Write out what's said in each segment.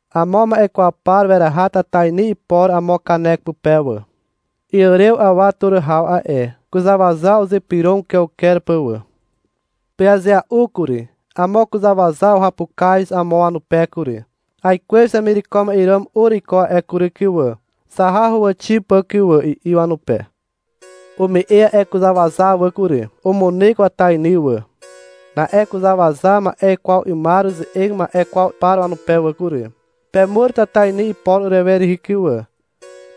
Amo ma'e kwaw par weraha tatainy ipor amo kanek pupe wà. Iàrew awa tur haw a'e. Kuzàwaza uzypyrog ukeuker pà wà. Pyazea'u kury. Amo kuzàwaza uhapukaz amo wanupe kury. — Aikwez hemireko ma'e ràm ur iko a'e kury kyn wà. Zaha huwàxi pà kyn wà, i'i wanupe. Ume'e a'e kuzàwaza wà kury. Umunyk watainy wà. Na'e kuzàwaza ma'e kwaw 'ymar uze'eg ma'e kwaw par wanupe wà kury. — Pemur tatainy ipor urewe rihi kyn wà,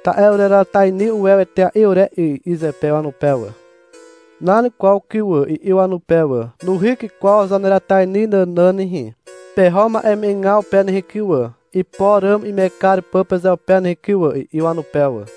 ta'e ureratainy uwew etea'i ure 'y, i'i zepe wanupe wà. — Nan kwaw kyn wà, i'i wanupe wà. Nuhyk kwaw zaneratainy nànàn nehe. Peho ma'eme'egaw pe nehe kyn wà, ipor ràm ime'eg kar pà pezeupe nehe kyn wà, i'i wanupe wà.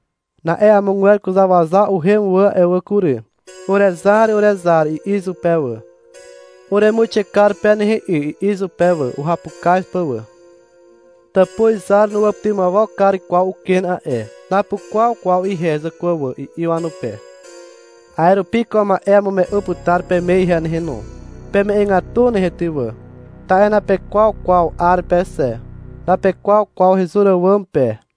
Na'e amogwer kuzàwaza uhem wà a'e wà kury. — Urezar, urezar, i'i izupe wà. — Uremuixe kar pe nehe 'y, i'i izupe wà, uhapukaz pà wà. Tàpuz izar nuwàpytymawok kar kwaw uken a'e. — Napukwaw kwaw ihe, zàkwà wà, i'i wanupe. A'e rupi ko ma'e amume'u putar peme ihe nehe no. Peme'egatu nehe ty wà, ta'e napekwaw kwaw 'ar pe xe, napekwaw kwaw hezur àwàm pe.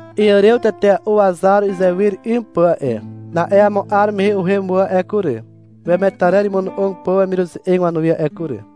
Iàrew tetea'u wazar uzewyr 'ym pà a'e. Na'e amo 'ar mehe uhem wà a'e kury, wemetarer imono'og pà wemiruze'eg wanuwi a'e kury.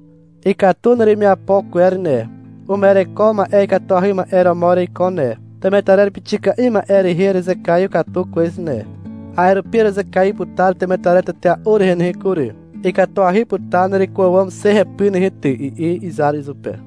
— Ikatu neremiapo kwer ne, uma'ereko ma'e ikatuahy ma'e romo ereiko ne. Temetarer pixika'i ma'e rehe erezekaiw katu kwez ne. A'e rupi erezekaiw putar temetarer tetea'u rehe nehe kury. Ikatuahy putar nereko àwàm xe hepyr nehe ty, i'i izar izupe.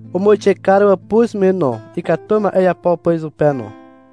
Umuixe kar wàpuz me no, ikatu ma'e iapo pà izupe no.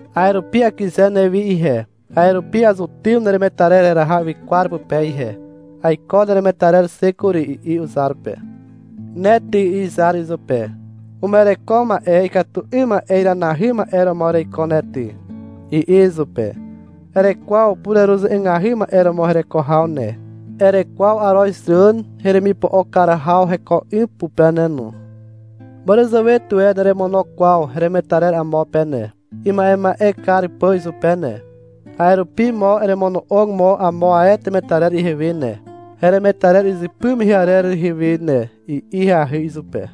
A'e rupi akyze newi ihe. A'e rupi azutym neremetarer heraha ywykwar pupe ihe. Aiko neremetarer xe kury, i'i uzar pe. — Ne ty, i'i izar izupe. — Uma'ereko ma'e ikatu 'ym ma'e iranahy ma'e romo ereiko ne ty, i'i izupe. — Erekwaw pureruze'egahy ma'e romo hereko haw ne. Erekwaw arozràn heremipo'o kar haw heko 'ym pupe ne no. Màràzàwe tuwe neremono kwaw heremetarer amo pe ne, ima'ema'e kar pà izupe ne. A'e rupi mo eremono'og mo amo ae temetarer ihewe ne, heremetarer izypy mehe arer rehe we ne, i'i ahyahy izupe.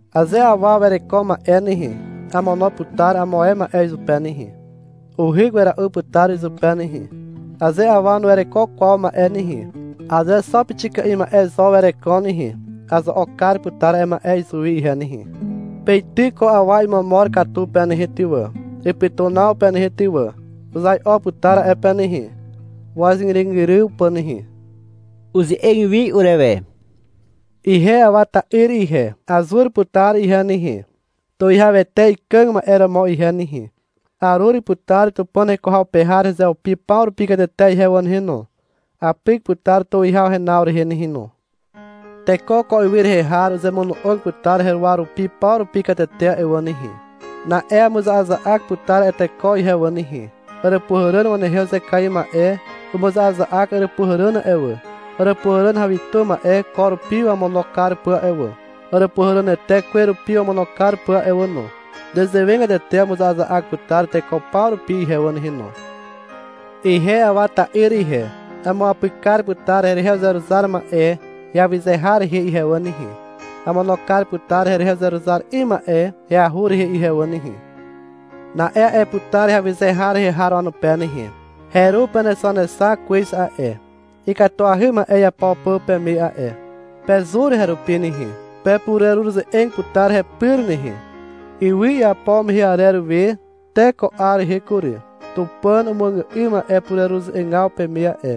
Aze awa wereko ma'e nehe, amono putar amo ae ma'e izupe nehe. Uhyk wera'u putar izupe nehe. Aze awa nuwereko kwaw ma'e nehe, aze xo pixika'i ma'e zo wereko nehe, azo'ok kar putar a'e ma'e izuwi ihe nehe. Peityk ko awa imomor katu pe nehe ty wà, ipytunaw pe nehe ty wà. Uzai'o putar a'e pe nehe, wàzgyrygyryw pà nehe. Uze'eg wi urewe. — Ihe Awa ta'yr ihe. Azur putar ihe nehe, Tuwihawete ikàg ma'e romo ihe nehe. Arur putar Tupàn heko haw pe har hezeupi paw rupi katete ihe wà nehe no. Apyk putar tuwihaw henaw rehe nehe no. Teko ko ywy rehe har uzemono'og putar heruwa rupi paw rupi katete a'e wà nehe. Na'e amuza'aza'ak putar a'e teko ihe wà nehe. Àràpuhàràn wanehe uzekaiw ma'e umuza'aza'ak àràpuhàràn a'e wà, àràpuhàràn hawitu ma'e ko rupi wamono kar pà a'e wà, àràpuhàrànete kwe rupi wamono kar pà a'e wà no. Nezewegatete amuza'aza'ak putar teko paw rupi ihe wà nehe no. Ihe Awa ta'yr ihe, amuapyk kar putar herehe uzeruzar ma'e heawyze har rehe ihe wà nehe. Amono kar putar herehe uzeruzar 'ym ma'e heahur rehe ihe wà nehe. Na'e a'e putar heawyze har rehe har wanupe nehe. — Heru penexanexak kwez a'e, ikatuahy ma'e iapo pà peme a'e. Pezur herupi nehe. Pepureruze'eg putar hepyr nehe. Ywy iapo mehe arer we te ko 'ar rehe kury, Tupàn umuàgà'ym a'e pureruze'egaw peme a'e.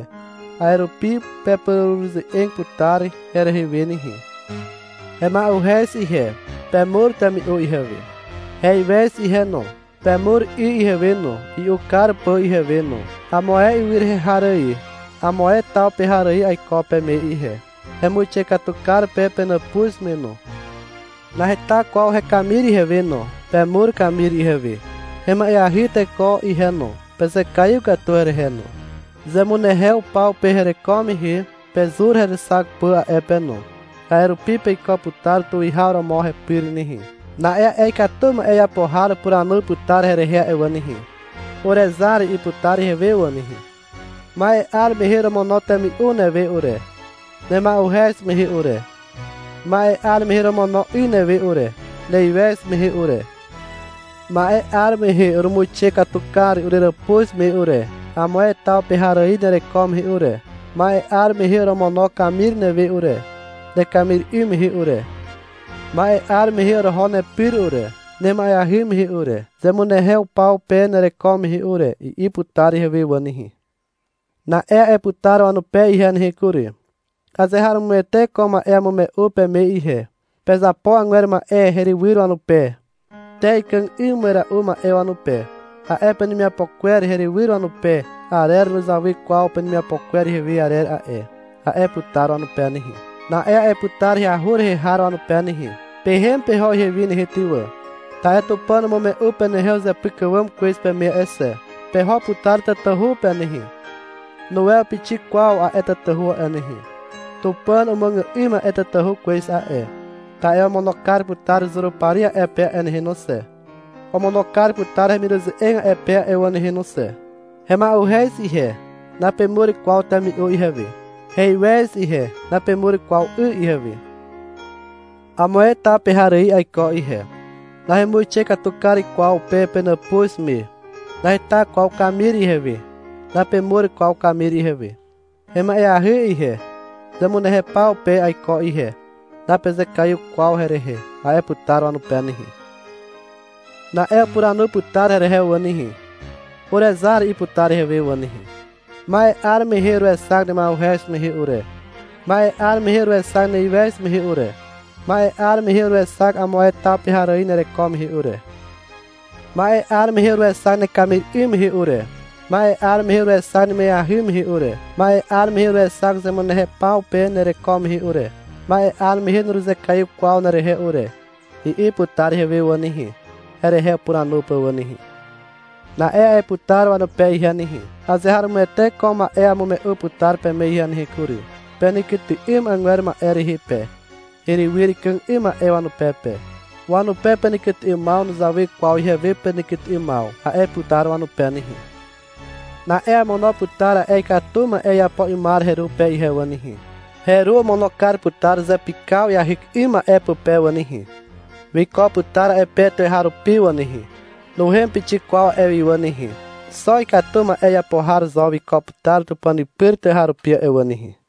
A'e rupi pepureruze'eg putar herehe we nehe. Hema'uhez ihe. Pemur temi'u ihewe. Heiwez ihe no. Pemur 'y ihewe no, i'u kar pà ihewe no. Amo ae ywy rehe har ài, amo ae taw pe har ài aiko peme ihe. Hemuixe katu kar pe penàpuz me no. Naheta kwaw hekamir ihewe no. Pemur kamir ihewe. Hema'eahy teko ihe no. Pezekaiw katu herehe no. Zemunehew paw pe hereko mehe pezur herexak pà a'e pe no. A'e rupi peiko putar tuwihaw romo hepyr nehe. Na'e a'e ikatu ma'e iapo har upuranu putar herehe a'e wà nehe. — Urezar, i'i putar ihewe wà nehe. — Ma'e 'ar mehe oromono temi'u newe ure, nema'uhez mehe ure. Ma'e 'ar mehe oromono 'y newe ure, neiwez mehe ure. Ma'e 'ar mehe urumuixe katu kar ureràpuz me ure, amo ae taw pe har ài nereko mehe ure. Ma'e 'ar mehe oromono kamir newe ure, nekamir 'ym mehe ure. Ma'e 'ar mehe oroho nepyr ure, nema'eahy mehe ure, zemunehew paw pe nereko mehe ure, i'i putar ihewe wà nehe. Na'e a'e putar wanupe ihe nehe kury. — Azeharomoete ko ma'e amume'u peme ihe. Pezapo agwer ma'e herywyr wanupe, te ikàg 'ym wera'u ma'e wanupe. A'e penemiapo kwer herywyr wanupe arer nuzawy kwaw penemiapo kwer ihewe arer a'e, a'e putar wanupe nehe. Na'e a'e putar heahur rehe har wanupe nehe. — Pehem peho ihewi nehe ty wà, ta'e Tupàn umume'u penehe uzepyk àwàm kwez peme a'e xe. Peho putar tatahu pe nehe. Nuwew pixik kwaw a'e tatahu a'e nehe. Tupàn umuàgà'ym a'e tatahu kwez a'e. Ta'e omono kar putar Zurupari a'e pe a'e nehe no xe. Omono kar putar hemiruze'eg a'e pe a'e wà nehe no xe. Hema'uhez ihe, napemur kwaw temi'u ihewe. Heiwez ihe. Napemur kwaw 'y ihewe. Amo ae taw pe har ài aiko ihe. Nahemuixe katu kar kwaw pe penàpuz me. Naheta kwaw kamir ihewe. Napemur kwaw kamir ihewe. Hema'eahy ihe. Zemunehew paw pe aiko ihe. Napezekaiw kwaw herehe, a'e putar wanupe nehe. Na'e upuranu putar herehe wà nehe. — Urezar, i'i putar ihewe wà nehe. — Ma'e 'ar mehe uruexak nema'uhez mehe ure. Ma'e 'ar mehe uruexak neiwez mehe ure. Ma'e 'ar mehe uruexak amo ae taw pe har ài nereko mehe ure. Ma'e 'ar mehe uruexak nekamir 'ym mehe ure. Ma'e 'ar mehe uruexak nema'eahy mehe ure. Ma'e 'ar mehe uruexak zemunehew paw pe nereko mehe ure. Ma'e 'ar mehe nuruzekaiw kwaw nerehe ure, i'i putar ihewe wà nehe, herehe upuranu pà wà nehe. Na'e a'e putar wanupe ihe nehe. — Azeharomoete ko ma'e amume'u putar peme ihe nehe kury. Penekyty'ym agwer ma'e rehe pe, herywyr ikàg 'ym ma'e wanupe pe. Wanupe penekyty'ymaw nuzawy kwaw ihewe penekyty'ymaw, a'e putar wanupe nehe. Na'e amono putar a'e ikatu ma'e iapo 'ymar heru pe ihe wà nehe. Heru omono kar putar zepykaw iahyk 'ym ma'e pupe wà nehe. Wiko putar a'e pe tuweharupi wà nehe. Nuhem pixik kwaw a'e wi wà nehe. Xo ikatu ma'e iapo har zo wiko putar Tupàn pyr tuweharupi a'e wà nehe.